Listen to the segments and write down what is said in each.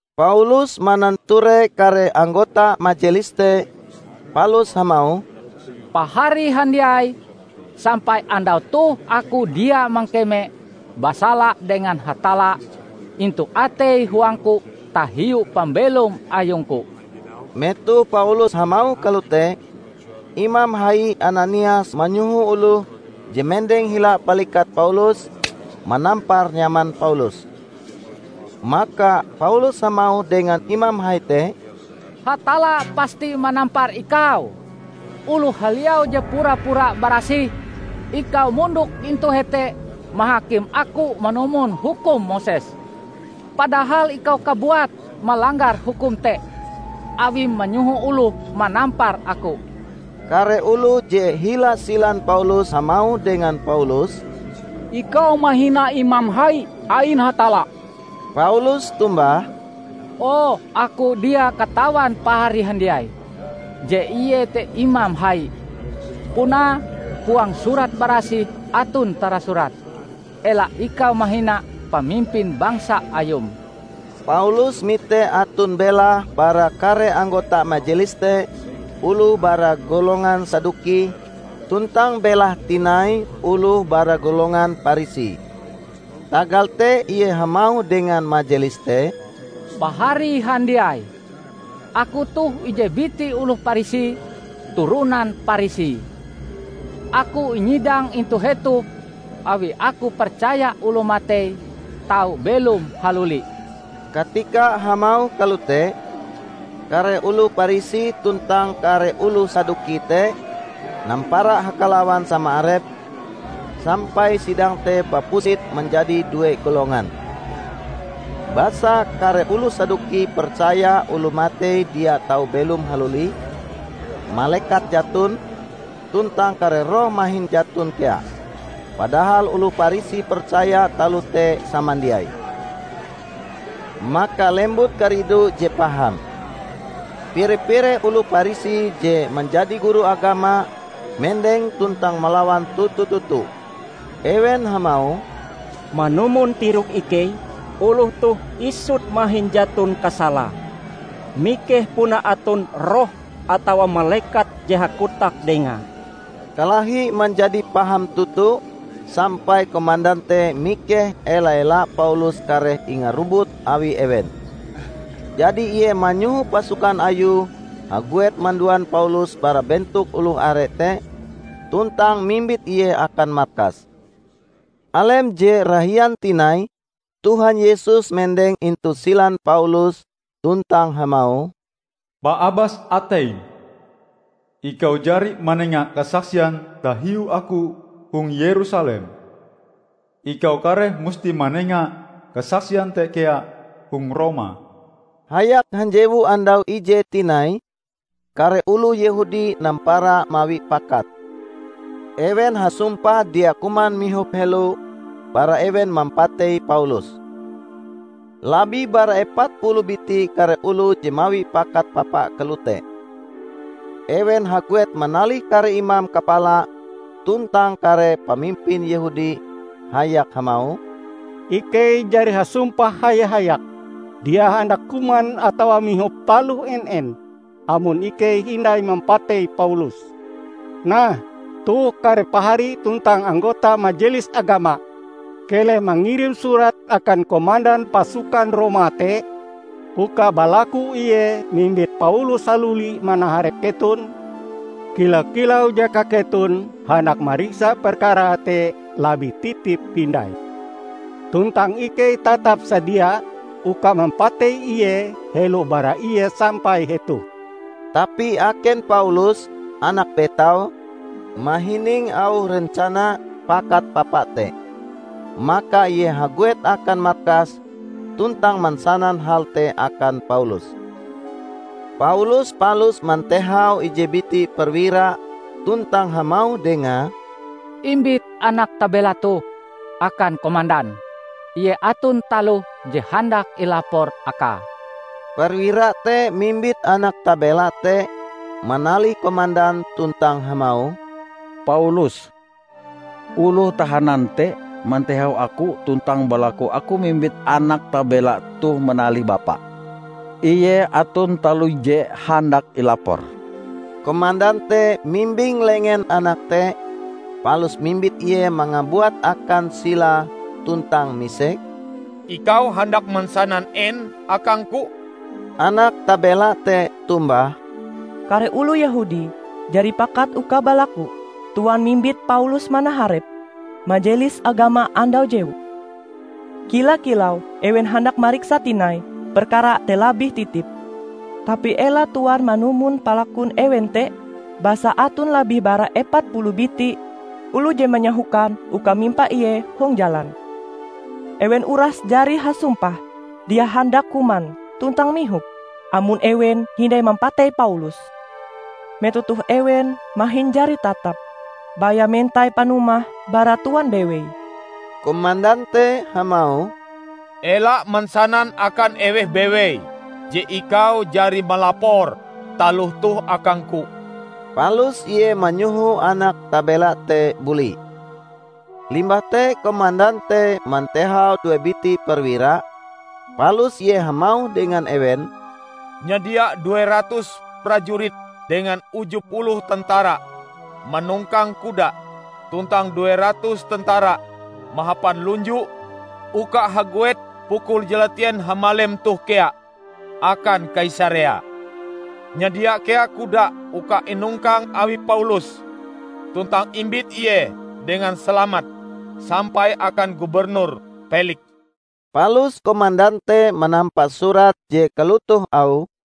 Paulus mananture kare anggota Majelis te palus hamauh, "Pahari handiai! Sampai andau toh aku dia mangkeme basala dengan Hatalla intu atei huangku tahiu pambelom ayungku." Metoh Paulus hamauh kalote, Imam Hai Ananias manyoho oloh je mendeng hila balikat Paulus manampar nyaman Paulus. Maka Paulus hamauh dengan imam hai te, "Hatalla pasti manampar ikau, oloh haliau je pura-pura barasih! Ikau mondok intu hete mahakim aku manumon hukum Moses, padahal ikau kabuat malanggar hukum te awim manyoho oloh manampar aku!" Kare oloh je hila silan Paulus hamauh dengan Paulus, "Ikau mahina imam hai ain Hatalla!" Paulus tombah, "Oh, aku dia katawan pahari handiai, je ie te imam hai. Punae huang Surat Barasih aton tarasurat, 'Ela ikau mahina pamimpin bangsa ayum.' " Paulus mite aton belahe bara kare anggota majelis te oloh bara golongan Saduki tuntang belahe tinai oloh bara golongan Parisi. Tagal te ie hamauh dengan majelis te, "Pahari handiai! Aku toh ije biti oloh Parisi, turonan Parisi. Aku inyidang intu hetoh awi aku percaya oloh matei tau belom haluli." Katika hamauh kalote, kare oloh Parisi tuntang kare oloh Saduki te nampara hakalawan sama arepe, sampai sidang te bapusit manjadi due golongan. ( Basa kare oloh Saduki percaya oloh matei dia tau belom haluli, malekat jaton, tuntang kare roh mahin jaton kea; padahal oloh Parisi percaya taloh te samandiai.) Maka lembut karidu je paham. Pire-pire oloh Parisi je manjadi guru agama mendeng tuntang malawan toto-toto. Ewen hamauh, "Manumon tirok ikei oloh toh isut mahin jaton kasalae! Mikeh puna aton roh atawa malekat je hakotak dengae!" Kalahi manjadi paham toto sampai komandan te mikeh ela-ela Paulus kareh ingarobut awi ewen. Jadi ie manyoho pasukan ayue haguet manduan Paulus bara bentok oloh are te tuntang mimbit ie akan markas. Alem je rahian tinai Tuhan Yesus mendeng intu silan Paulus tuntang hamauh, "Paabas ateim! Ikau jari manenga kasaksian tahiu aku hong Yerusalem. Ikau kareh musti manenga kasaksian te kea hong Roma." Hayak hanjewu andau ijee tinai, kare oloh Yehudi nampara mawi pakat. Ewen hasumpah dia kuman mihop helo bara ewen mampatei Paulus. Labih bara epat puluh biti kare oloh je mawi pakat papa kalote. Ewen haguet manalih kare imam kapala tuntang kare pamimpin Yehudi hayak hamauh, "Ikei jari hasumpah haya-hayak, dia handak kuman atawa mihop taloh en-en amon ikei hindai mampatei Paulus. Nah, toh kare pahari tuntang anggota Majelis Agama keleh mangirim surat akan komandan pasukan Roma te uka balaku ie mimbit Paulus haluli manaharep keton, kila-kilau jaka keton handak mariksa perkarae te labih titip hindai. Tuntang ikei tatap sadia uka mampatei ie helo bara ie sampai hetoh." Tapi aken Paulus, (anak betaue) mahining auh rencana pakat papa te. Maka ie haguet akan markas tuntang mansanan hal te akan Paulus. Paulus palus mantehau ije biti perwira tuntang hamauh dengae, "Imbit anak tabela toh akan komandan; ie aton taloh je handak ilapore akae." Perwira te mimbit anak tabela te manalih komandan tuntang hamauh, "Paulus, oloh tahanan te, mantehau aku tuntang balaku aku mimbit anak tabela toh manalih bapa; ie aton taloh je handak ilapore." Komandan te mimbing lengen anak te, palus mimbit ie mangabuat akan silae tuntang misek, "Ikau handak mansanan en akangku?" Anak tabela te tombah, "Kare oloh Yehudi jari pakat uka balaku Tuan mimbit Paulus manaharep Majelis Agama andau jewu, kila-kilau ewen handak mariksa tinai perkara te labih titip. Tapi ela Tuan manumon palakun ewen te, basa aton labih bara epat puluh biti oloh je manyahokan uka mimpa ie hong jalan. Ewen uras jari hasumpah dia handak kuman tuntang mihop amon ewen hindai mampatei Paulus. Metoh toh ewen mahin jari tatap; baya mentai panumah bara Tuan bewei." Komandan te hamauh, "Ela mansanan akan eweh bewei je ikau jari malapor taloh toh akangku." Palus ie manyoho anak tabela te buli. Limbah te komandan te mantehau due biti perwira, palus ie hamauh dengan ewen, "Nyadia due ratus prajurit dengan uju puluh tentara manongkang kuda tuntang due ratus tentara mahapan lunju uka haguet pukul jalatien hamalem toh kea akan Kaisarea. Nyadia kea kuda uka inongkang awi Paulus tuntang imbit ie dengan salamat sampai akan Gubernur Peliks." Palus komandan te manampa surat je kalotoh auhe,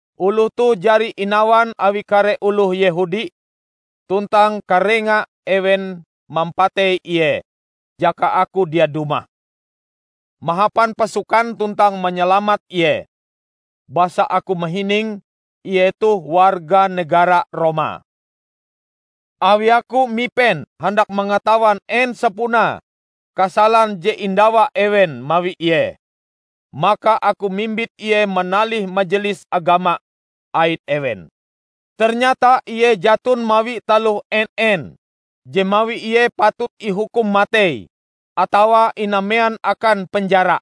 Oloh toh jari inawan awi kare oloh Yehudi tuntang karenga ewen mampatei ie jaka aku dia dumah mahapan pasukan tuntang manyalamat ie; basa aku mahining ie toh warga negara Roma. Awi aku mipen handak mangatawan en sapunae kasalan je indawa ewen mawi ie, maka aku mimbit ie manalih Majelis Agama ain ewen. Ternyata ie jaton mawi taloh en-en je mawi ie patut ihukum matei atawa inamean akan penjara.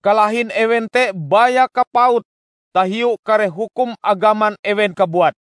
Kalahin ewen te baya kapaut tahiu kare hukum agaman ewen kabuat.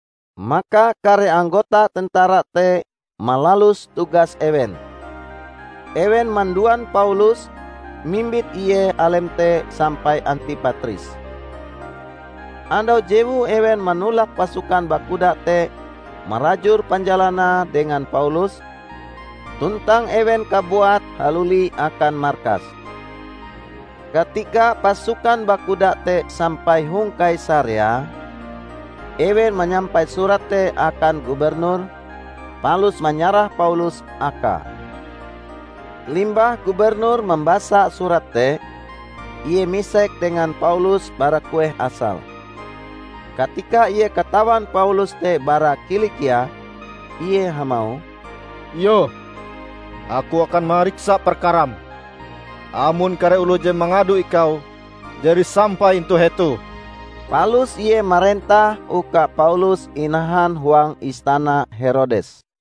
Maka kare anggota tentara te malalus tugas ewen. Ewen manduan Paulus mimbit ie alem te sampai Antipatris. Andau jewue ewen manolak pasukan bakuda te marajur panjalanae dengan Paulus, tuntang ewen kabuat haluli akan markas. Katika pasukan bakuda te sampai hong Kaisarea, ewen manyampai surat te akan Gubernur, palus manyarah Paulus akae. Limbah Gubernur mambasa surat te, ie misek dengan Paulus bara kueh asale. Katika ie katawan Paulus te bara Kilikia, ie hamauh, "Iyoh! Aku akan mariksa perkaram, amon kare oloh je mangado ikau jari sampai intu hetoh." Palus ie marentah uka Paulus inahan huang istana Herodes.